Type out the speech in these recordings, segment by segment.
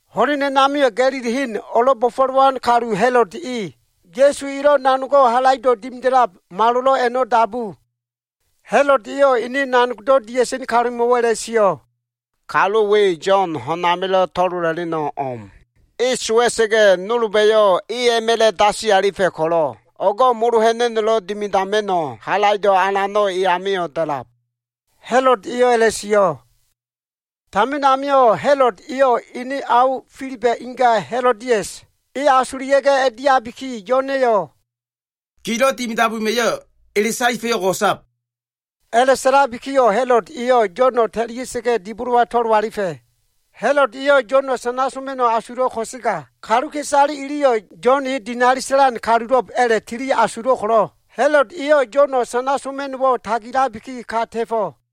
Ho꞉len a꞉namio꞉ Ga꞉lili hen o꞉lo꞉ bo꞉fo꞉lowan kalu Ha꞉lod e, Ya꞉su elo꞉ nanogo꞉ halaido꞉ dimida꞉lab malolo꞉ a꞉no꞉ dabu. Ha꞉lod eyo꞉ ene nanogdo꞉ dia꞉sen kalumo꞉wo꞉ a꞉la꞉sio꞉, “Kalu we Yo꞉n, ho꞉n amilo꞉ to꞉lola꞉leno꞉ o꞉m. E sowa꞉sa꞉ga꞉, nolba꞉yo꞉ e a꞉ma꞉la꞉ dasi alifa꞉ ko꞉lo꞉, o꞉go꞉ molo ha꞉na꞉no꞉lo꞉ dimidama꞉no꞉ halaido꞉ alano꞉ e amio꞉ da꞉lab.” Ha꞉lod eyo꞉ a꞉la꞉sio꞉. Tamin amio꞉, Ha꞉lod eyo꞉ ene ao Filiba꞉ inga Ha꞉lodias, e asulia꞉ga꞉ a꞉diabiki, Yo꞉na꞉yo꞉, “Gilo꞉ dimidab wema꞉yo꞉ ele saefa꞉yo꞉ o꞉go꞉sab.” A꞉la꞉sa꞉labikiyo꞉ Ha꞉lod eyo꞉ Yo꞉no꞉ ta꞉lia꞉sa꞉ga꞉ dibolowa to꞉lo alifa꞉. Ha꞉lod eyo꞉ Yo꞉no꞉ sana soma꞉no꞉ asulo꞉ ko꞉sega, kaluka꞉isale iliyo꞉ Yo꞉n e dinali sa꞉lan kalulo꞉b a꞉la꞉tili asulo꞉ ko꞉lo꞉, Ha꞉lod eyo꞉ Yo꞉no꞉ sana soma꞉no꞉wo꞉ tagilabiki, ka ta꞉fo꞉.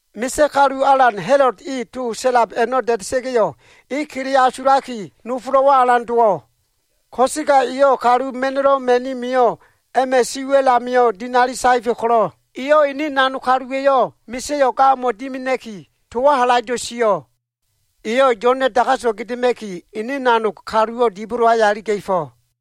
Misa꞉ kalu alan Ha꞉lod e to sa꞉lab a꞉no꞉ da꞉da꞉sa꞉ga꞉yo꞉, e kele asulaki nofolo꞉wo꞉ alan dowo꞉. Ko꞉sega eyo꞉ kalu ma꞉no꞉lo꞉ ma꞉ni mio꞉ a꞉ma꞉ si wa꞉l amio꞉ dinali saefa꞉ ko꞉lo꞉, eyo꞉ ene nanog kaluwa꞉yo꞉ misa꞉yo꞉ ga o꞉mo꞉ dimina꞉ki towo꞉ halaido꞉ sio꞉. Eyo꞉ Yo꞉na꞉ dagaso꞉ gedema꞉ki ene nanog kaluwo꞉ dibolo aya iliga꞉fo꞉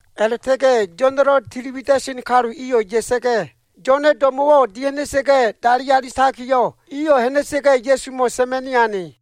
A꞉la꞉ta꞉ga꞉ Yo꞉na꞉lo꞉ tili wida꞉sen kalu iyo꞉ ya꞉sa꞉ga꞉, Yo꞉na꞉ do꞉mo꞉wo꞉ dia꞉ha꞉na꞉sa꞉ga꞉ dali alitakiyo꞉, iyo꞉ ha꞉na꞉sa꞉ga꞉ Ya꞉sumo꞉ sa꞉ma꞉ni ane.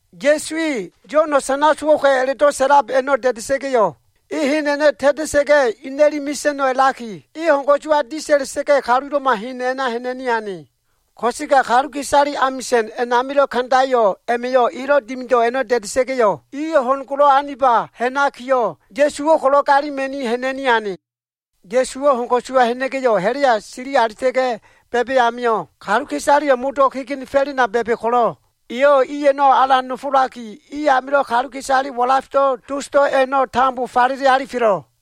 Ya꞉su e Yo꞉no꞉ sana sowo꞉ka꞉ a꞉la꞉do꞉ sa꞉lab a꞉no꞉ da꞉da꞉sa꞉ga꞉yo꞉, e hen a꞉no꞉ ta꞉ta꞉sa꞉ga꞉, e ina꞉li o꞉dofa꞉no꞉ a꞉laki, ho꞉n ko꞉suwa disa꞉ta꞉ga꞉, kalulo꞉ma hen a꞉na ha꞉na꞉ni ane. Ko꞉sega kaluka꞉isale amisa꞉n a꞉namilo꞉ kandayo꞉ a꞉ma꞉yo꞉ elo꞉ dimido꞉ a꞉no꞉ da꞉da꞉sa꞉ga꞉yo꞉, iyo꞉ ho꞉n golo꞉ aniba ha꞉nakiyo꞉, Ya꞉suwo꞉ ko꞉lo꞉ galima꞉ni ha꞉na꞉ni ane. Ya꞉suwo꞉ ho꞉n ko꞉suwa ha꞉na꞉ga꞉yo꞉, ha꞉la꞉ya sili alita꞉ga꞉ ba꞉ba꞉ amio꞉, kaluka꞉isale modo꞉ kegenefo꞉lena ba꞉ba꞉ ko꞉lo꞉, eyo꞉ i a꞉no꞉ alan nofolaki, i amilo꞉ kaluka꞉isale walafdo꞉ dosdo꞉ a꞉no꞉ tambo falele alifelo꞉.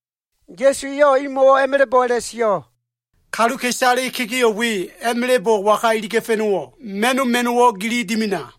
Ya꞉su eyo꞉ imo꞉wo꞉ a꞉ma꞉la꞉bo꞉ a꞉la꞉sio꞉, “Kaluka꞉isale kegeo꞉ we a꞉ma꞉la꞉bo꞉ waga iliga꞉fa꞉no꞉wo꞉? Ma꞉no꞉ ma꞉no꞉wo꞉ gili dimina.”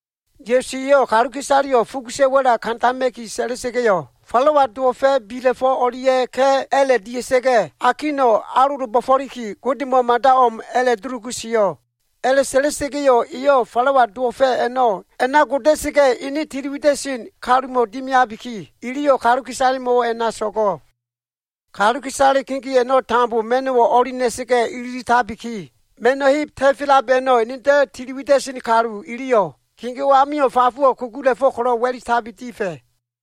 Ya꞉su eyo꞉ kaluka꞉isaleyo꞉ fugusa꞉ wa꞉la kandama꞉ki sa꞉la꞉sa꞉ga꞉yo꞉, falawa dowo꞉fa꞉ bila꞉fo꞉ o꞉lia꞉ ka꞉ a꞉la꞉ dia꞉sa꞉ga꞉, akino꞉ alolo bo꞉fo꞉liki, Godemo꞉ mada o꞉m a꞉la꞉dulugu sio꞉. A꞉la꞉sa꞉la꞉sa꞉ga꞉yo꞉ eyo꞉ falawa dowo꞉fa꞉ a꞉no꞉ a꞉na goda꞉sa꞉ga꞉, ene tiliwida꞉sen kalumo꞉ dimiabiki, iliyo꞉ kaluka꞉isalemo꞉wo꞉ a꞉na so꞉go꞉. Kaluka꞉isale kegeo꞉ a꞉no꞉ tambo ma꞉no꞉wo꞉ o꞉li na꞉sa꞉ga꞉ ililitabiki, ma꞉no꞉ heb ta꞉felab a꞉no꞉ enedo꞉ tili wida꞉sen kalu iliyo꞉ kegeo꞉ amio꞉ fafowo꞉ kugula꞉fo꞉ ko꞉lo꞉ wa꞉litabi difa꞉.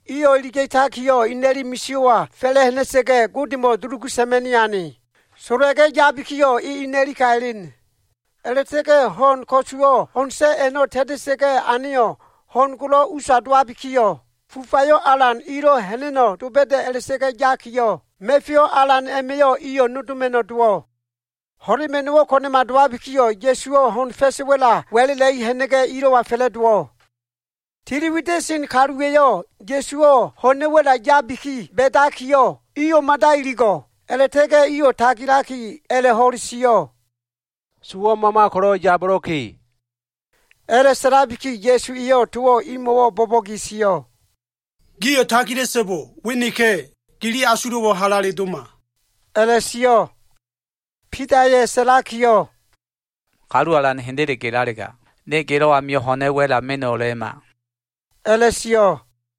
Iyo꞉ iliga꞉takiyo꞉ ina꞉li misio꞉wa fa꞉la꞉ ha꞉na꞉sa꞉ga꞉, Godemo꞉ dulugu sa꞉ma꞉ni ane. Sola꞉ga꞉ yabikiyo꞉ e ina꞉li ka elen. A꞉la꞉ta꞉ga꞉ ho꞉n ko꞉suwo꞉ ho꞉n sa꞉ a꞉no꞉ ta꞉ta꞉sa꞉ga꞉ aneyo꞉, ho꞉n golo꞉ usa dowabikiyo꞉, fufayo꞉ alan ilo꞉ ha꞉na꞉no꞉ doba꞉da꞉ a꞉la꞉ta꞉ga꞉ yakiyo꞉, ma꞉feyo꞉ alan a꞉ma꞉yo꞉ iyo꞉ nodoma꞉no꞉ dowo꞉. Ho꞉lema꞉no꞉wo꞉ ko꞉na꞉ma dowabikiyo꞉, Ya꞉suwo꞉ ho꞉n fa꞉sa꞉ wa꞉la wa꞉la꞉la꞉li ha꞉na꞉ga꞉, ilo꞉wa fa꞉la꞉dowo꞉ Tiliwida꞉sen kaluwa꞉yo꞉ Ya꞉suwo꞉ ho꞉na꞉ wa꞉la yabiki ba꞉ba꞉ amio꞉, iyo꞉ mada iligo꞉. A꞉la꞉ta꞉ga꞉ iyo꞉ tagilaki a꞉la꞉ho꞉le sio꞉, “Sowo꞉ mama ko꞉lo꞉ yabolo꞉ka꞉!” A꞉la꞉sa꞉labiki, Ya꞉su eyo꞉ towo꞉ imo꞉wo꞉ bo꞉bo꞉ge sio꞉, “Gio꞉ tagila꞉so꞉bo. We neka꞉! Gili asulo꞉wo꞉ halale doma,” a꞉la꞉sio꞉. Bidaya꞉ sa꞉lakiyo꞉, “Kalu Alan hendele gelalega, ne gelo꞉ amio꞉ ho꞉na꞉ wa꞉la menalema,” a꞉la꞉sio꞉.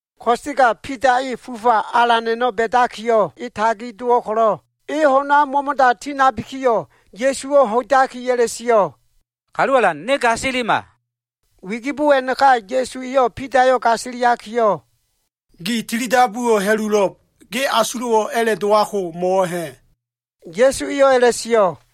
Ko꞉sega Bida e fufa alan a꞉no꞉ ba꞉dakiyo꞉ e tagi dowo꞉ ko꞉lo꞉, e ho꞉n amio꞉ mo꞉mo꞉da tinabikiyo꞉, Ya꞉suwo꞉ ho꞉idaki a꞉la꞉sio꞉, “Kalu Alan, ne gasilima.” Wigibo a꞉naka Ya꞉su eyo꞉ Bidayo꞉ gasiliakiyo꞉, “Gi tilidabuwo꞉ ha꞉lulo꞉b. Ge asulo꞉wo꞉ a꞉la꞉ dowabko꞉ mo꞉wo꞉ ha꞉?” Ya꞉su eyo꞉ a꞉la꞉sio꞉.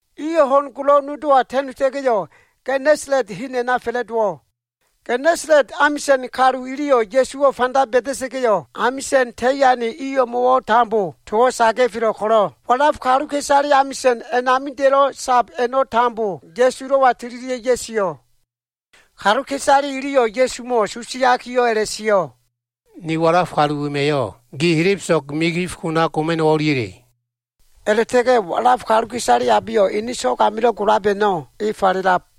Iyo꞉ ho꞉n golo꞉ nodowa ta꞉nota꞉ga꞉yo꞉, Genesalet hen a꞉na fa꞉la꞉dowo꞉. Genesalet amisa꞉n kalu iliyo꞉ Ya꞉suwo꞉ fanda ba꞉da꞉sa꞉ga꞉yo꞉, towo꞉ amisa꞉n ta꞉i ane o꞉mo꞉wo꞉ tambo saga꞉felo꞉ ko꞉lo꞉, walaf kaluka꞉isale amisa꞉n a꞉namida꞉lo꞉ sab a꞉no꞉ tambo Ya꞉sulo꞉wa tililia꞉ ya꞉sio꞉. Kaluka꞉isale iliyo꞉ Ya꞉sumo꞉ susiakiyo꞉ a꞉la꞉sio꞉, “Ni walaf kalu wema꞉yo꞉ gi helebeso꞉g migif kona goma꞉no꞉wo꞉ o꞉liya꞉le?” A꞉la꞉ta꞉ga꞉ walaf kaluka꞉isale abeyo꞉ ene so꞉g amilo꞉ golab a꞉no꞉, e falelab.